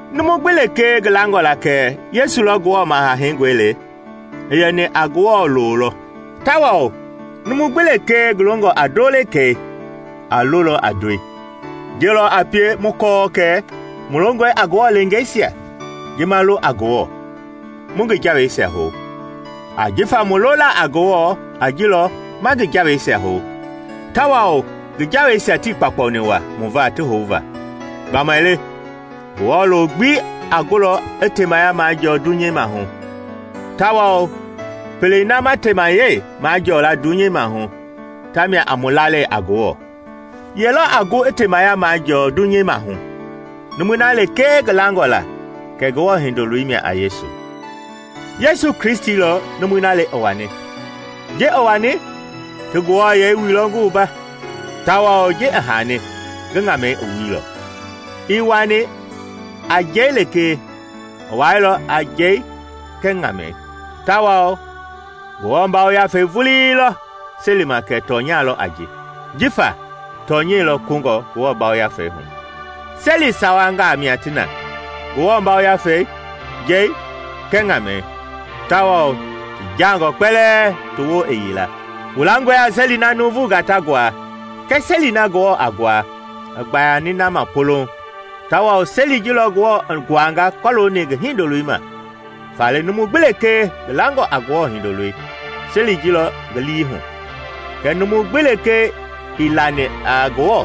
Numu gbi lekee ngi langɔ la kɛ Yesu lɔ Ngewɔ Maha Heingɔi le, i yɛni a Ngewɔ loo lɔ, tawao numu gbi lekee ngi longɔ a ndoo le kɛi a lolɔ a ndoi. Ji lɔ a pie mu kɔɔ kɛ mu longɔe a Ngewɔ leengeisia, ji ma lo a Ngewɔ, mu ngi jaweisia hou. Ajifa mu lola a Ngewɔ a ji lɔ ma ngi jaweisia hou. Tawao ngi jaweisia tii kpaukpauni waa mu va ti houva. Gbamaile Ngewɔ loo gbi a gulɔ i temaya majɔɔ dunyei maahu; tawao pelei na ma temayɛi majɔɔ la dunyei maahu tamia a mu lalei a Ngewɔ. Ye lɔ a gu i temaya majɔɔ dunyei maahu? Numui na lekee ngi langɔ la kɛ Ngewɔ Hindoloi mia a Yesu. Yesu Kristi lɔ numui na le i wani; ji i wani ti ngi wuailɔ a Ngewɔ yɛi tawao ji i haani ngi ŋamɛi wuilɔ. Ii wani a njɛi lekee, i wailɔ a njɛi kɛɛ ŋamɛi. Tawao Ngewɔ Yafei vulii lɔ selima kɛ tɔnya lɔ a ji, jifa tɔnyɛi lɔ kungɔ Ngewɔ Yafei hu. Seli sawangaa mia ti na: Ngewɔ Yafei, njɛi kɛɛ ŋamɛi; tawao ti jaangɔɔ kpɛlɛɛ ti woo i yila. Wu langɔe a seli na nuuvungaa ta nguaa, kɛɛ seli na Ngewɔ a nguaa i gbayani na ma polouŋ, tawao seli ji lɔ Ngewɔ i nguanga kɔlooni ngi Hindoloi ma. Faale numu gbi lekee ngi langɔ a Ngewɔ Hindoloi, seli ji lɔ ngi lii hu; kɛɛ numu gbi lekee ii lani a Ngewɔ,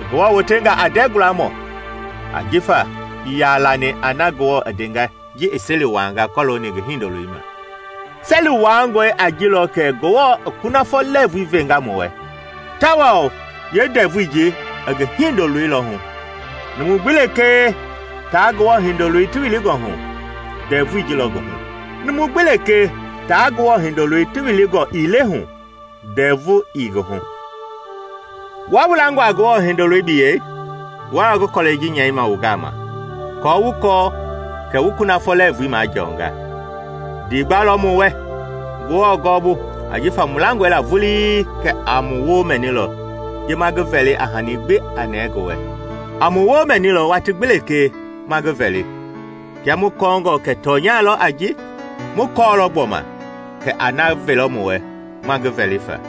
i Ngewɔ wotenga a ndɛɛ gualamɔ, ajifa ii yaa lani a na Ngewɔ i ndenga ji i seli wuaanga kɔlooni ngi Hindoloi ma. Seli wuaangɔi a ji lɔ kɛ Ngewɔ i kunafɔ lɛɛvui venga mu wɛ, tawao yeendɛvui ji i ngi Hindoloi lɔ hu. Numu gbi lekee taa Ngewɔ Hindoloi ti wilingɔ hu, ndɛvui ji lɔ ngi hu; numu gbi lekee taa Ngewɔ Hindoloi ti wilingɔ ii le hu, ndɛvu ii ngi hu. Wua wu langɔ a Ngewɔ Hindoloi biyɛi, wua lɔ ngi kɔlɛi ji nyɛima wu gama aako wu kɔ kɛ wu kunafɔ lɛɛvui majɔnga. Ndiigba lɔ mu wɛ Ngewɔ gɔɔbu ajifa mu langɔe la vulii kɛ a mu woo mɛnilɔ ji ma ngi vɛli a hani gbi a nɛɛ ngi wɛ. A mu woo mɛnilɔ watii gbi lekee ma ngi vɛli; kia mu kɔɔngɔ kɛ tɔnya lɔ a ji, mu kɔɔlɔ gbɔma kɛ a na velɔ mu wɛ ma ngi vɛli fa.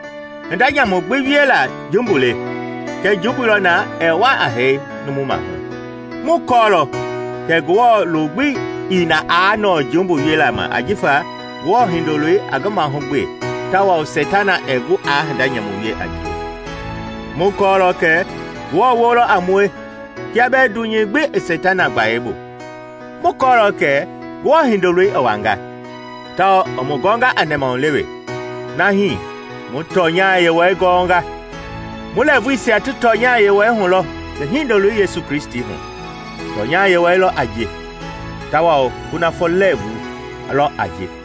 Hinda nyamu gbi wiela jumbu le, kɛɛ jumbui lɔ na ɛɛ wa a hee numu maahu. Mu kɔɔlɔ kɛ Ngewɔ loo gbi ii na aa nɔɔ jumbu wiela ma jifa Ngewɔ Hindoloi a ngi mahugbe tawao Seitana ɛɛ gu aa hinda nyamu wie a ngie. Mu kɔlɔ kɛ Ngewɔ woo lɔ a mue kia bɛɛ dunyei gbi i Seitana gbayei bu. Mu kɔɔlɔ kɛ Ngewɔ Hindoloi i wanga, tawao i mu gɔnga a nɛmahulewe, na hii mu tɔnya Yewɔɛi gɔnga. Mu lɛɛvuisia ti tɔnya Yewɔɛi hu lɔ ngi Hindoloi Yesu Kristi hu. Tɔnya Yewɔɛi lɔ a ji, tawao kunafɔ lɛɛvu lɔ a ji.